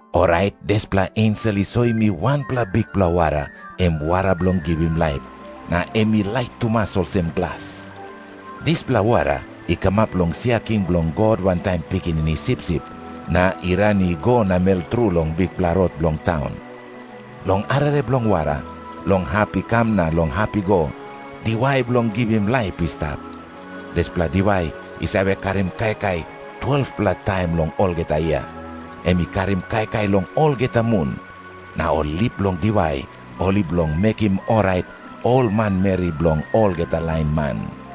Orait dispela ensel i soim mi wanpela bikpela wara, em wara bilong givim laip, na em i lait tumas olsem glas. Dispela wara i kamap long sia king bilong God wantaim Pikinini Sipsip, na i ran i go namel tru long bikpela rot bilong taun. Long arere bilong wara, long hap i kam na long hap i go, diwai bilong givim laip i stap. Dispela diwai i save karim kaikai 12-pela taim long olgeta yia. Em i karim kaikai long olgeta mun. Na ol lip bilong diwai ol i bilong mekim orait ol manmeri bilong olgeta lain man.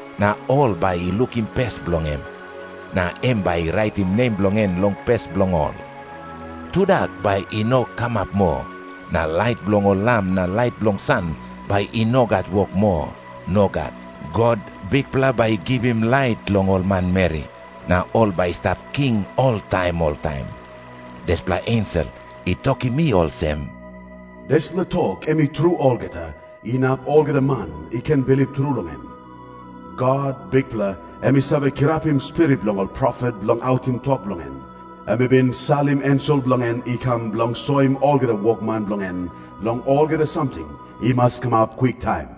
na ol bai i lukim pes bilong em. Na em bai i raitim nem bilong en long pes bilong ol. Tudak bai i no kamap moa, na lait bilong ol lam na lait bilong san bai i no gat wok moa. Nogat. God, Bikpela bai i givim lait long ol manmeri. Na ol bai i stap king oltaim oltaim. Dispela ensel i tokim mi olsem, "Dispela tok em i tru olgeta, inap olgeta man i ken bilip tru long em. God, Bikpela, em i save kirapim spirit bilong ol profet bilong autim tok bilong en, em i bin salim ensel bilong en i kam bilong soim olgeta wokman bilong en long olgeta samting i mas kamap kwiktaim.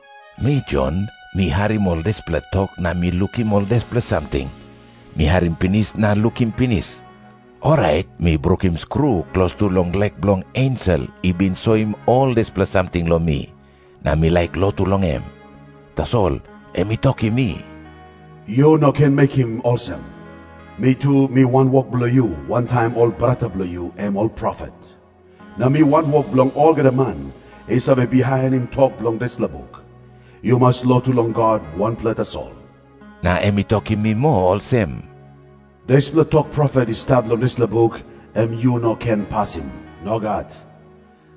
Mi Jon, mi harim ol dispela tok na mi lukim ol dispela samting. Mi harim pinis na lukim pinis, orait mi brukim skru klostu long lek bilong ensel i bin soim ol dispela samting long mi, na mi laik lotu long em. Tasol em i tokim mi, "Yu no ken mekim olsem! Mi tu mi wanwok bilong yu wantaim ol brata bilong yu, em ol profet. Na mi wanwok bilong olgeta man i save bihainim tok bilong dispela buk. Yu mas lotu long God wanpela tasol." Na em i tokim mi moa olsem, "Dispela tok profet i stap long dispela buk, em yu no ken pasim. Nogat.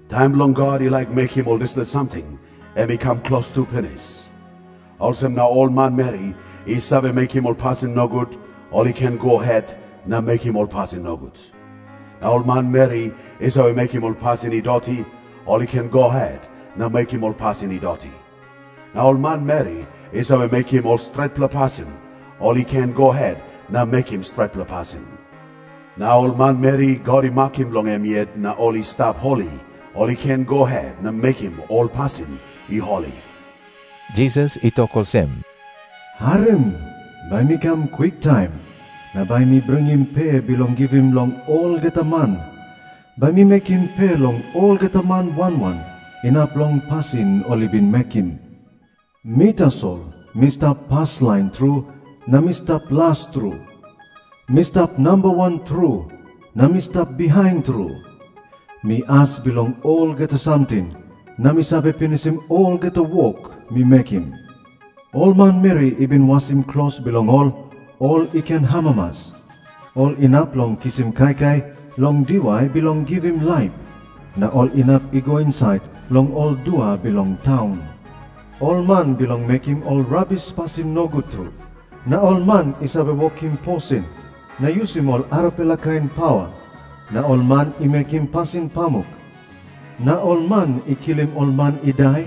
Taim bilong God i laik mekim ol dispela samting, em i kam klostu pinis. Olsem na ol manmeri i save mekim ol pasin nogut, ol i ken go het na mekim ol pasin nogut. Na ol manmeri i save mekim ol pasin i doti, ol i ken go het na mekim ol pasin i doti. Na ol manmeri i save mekim ol stretpela pasin, ol i ken go het na mekim stretpela pasin. Na ol manmeri God i makim bilong em yet na ol i stap holi, ol i ken go het na mekim ol pasin i holi." Jisas i tok olsem, "Harim. Bai mi kam kwiktaim. Na bai mi bringim pe bilong givim long olgeta man. Bai mi bekim pe long olgeta man wan wan, inap long pasin ol i bin mekim. Mi tasol mi stap paslain tru na mi stap las tru. Mi stap namba wan tru na mi stap bihain tru. Mi as bilong olgeta samting, na mi save pinisim olgeta wok mi mekim. "Ol manmeri i bin wasim klos bilong ol, ol i ken amamas. Ol inap long kisim kaikai long diwai bilong givim laip. Na ol inap i go insait long ol dua bilong taun. Ol man bilong mekim ol rabis pasin nogut tru na ol man i save wokim posin na yusim ol arapela kain pawa na ol man i mekim pasin pamuk na ol man i kilim ol man i dai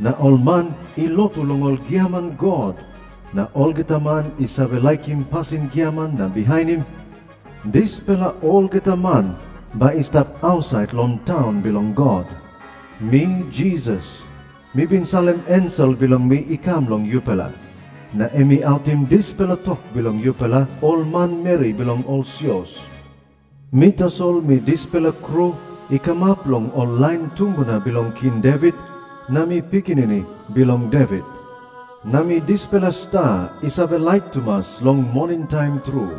na ol man i lotu long ol giaman god na olgeta man i save laikim pasin giaman na bihainim, dispela olgeta man bai i stap ausait long taun bilong God. Mi Jisas, mi bin salim ensel bilong mi i kam long yupela, na em i autim dispela tok long yupela ol manmeri bilong ol sios. Mi tasol mi dispela Kru i kamap long ol lain tumbuna bilong King Devit, na mi Pikinini Bilong Devit. Na mi dispela sta i save lait tumas long moningtaim tru."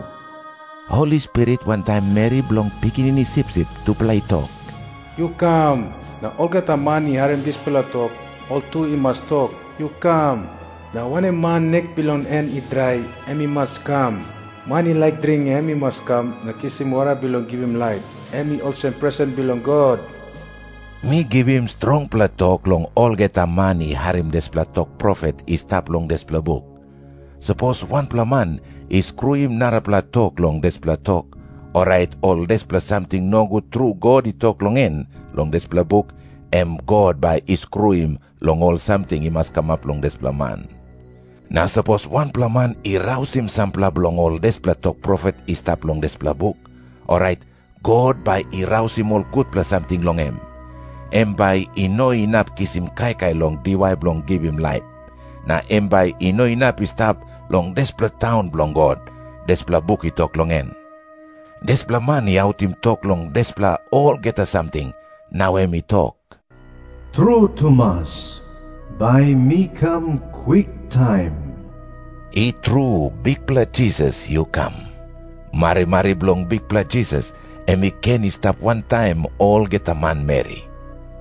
Holi Spirit wantaim meri bilong Pikinini Sipsip tupela i tok, "Yu kam." Na olgeta man i harim dispela tok, ol tu i mas tok, "Yu kam." Na wanem man nek bilong en i drai, em i mas kam. Man i laik dring, em i mas kam na kisim wara bilong givim laip, em i olsem presen bilong God. Mi givim strongpela tok long olgeta man i harim dispela tok profet i stap long dispela buk. Sapos wanpela man i skruim narapela tok long dispela tok, orait ol dispela samting nogut tru God i tok long en long dispela buk, em God bai i skruim long ol samting i mas kamap long dispela man. Na sapos wanpela man i rausim sampela bilong ol dispela tok profet i stap long dispela buk, orait God bai i rausim ol gutpela samting long em. Em bai i no inap kisim kaikai long diwai bilong givim laip, na em bai i no inap i stap long dispela taun bilong God, dispela buk i tok long en. Dispela man i autim tok long dispela olgeta samting, nau em i tok, "Tru tumas, bai mi kam kwiktaim." I tru Bikpela Jisas, yu Km. Marimari bilong Bikpela Jisas em i ken i stap wantaim olgeta manmeri.